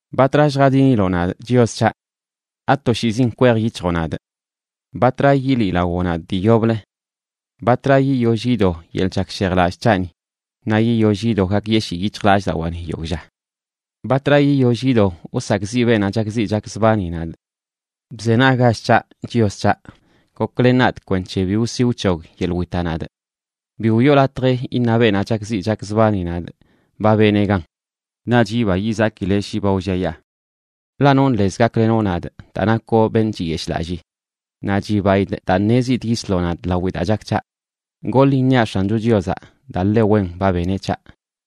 ¿Batra lljadiniloꞌ nadꞌ, Chios c̱haꞌ? ¿Atoshiizin kwej yic̱hjoꞌ nadꞌ? ¿Batra yiliꞌlawoꞌ nadꞌ dii yoblə? ¿Batra yiyoll yido yeḻꞌ chakshejlallꞌ c̱haꞌni naꞌ yiyoll yido gakyeshii yic̱hjlallꞌdawaani yogꞌ lla? ¿Batra yiyoll yido wsakꞌziꞌ beenaꞌ chakziꞌ chakzbani nadꞌ? Bzenaggach c̱haꞌ, Chios c̱haꞌ. Goklen nadꞌ kwenc̱he bi wsi wc̱hog yeḻꞌ witaꞌ nadꞌ. Bi wiꞌo latj iṉa beenaꞌ chakziꞌ chakzbani nadꞌ: “Ba benee gan.” Naꞌch yiba yizakileꞌ shi ba wlliayaa. Ḻaꞌ nonꞌ lez gaklenoꞌ nadꞌ daa nakoꞌ beṉꞌ chiyeshꞌlallii. Naꞌ chibaidꞌ daa ṉezidꞌ yisloꞌ nadꞌ lawi daa chak c̱haꞌ. Goḻ iṉiaꞌ X̱ancho Chiozaꞌ, daa ḻe wen ba beneꞌ c̱haꞌ.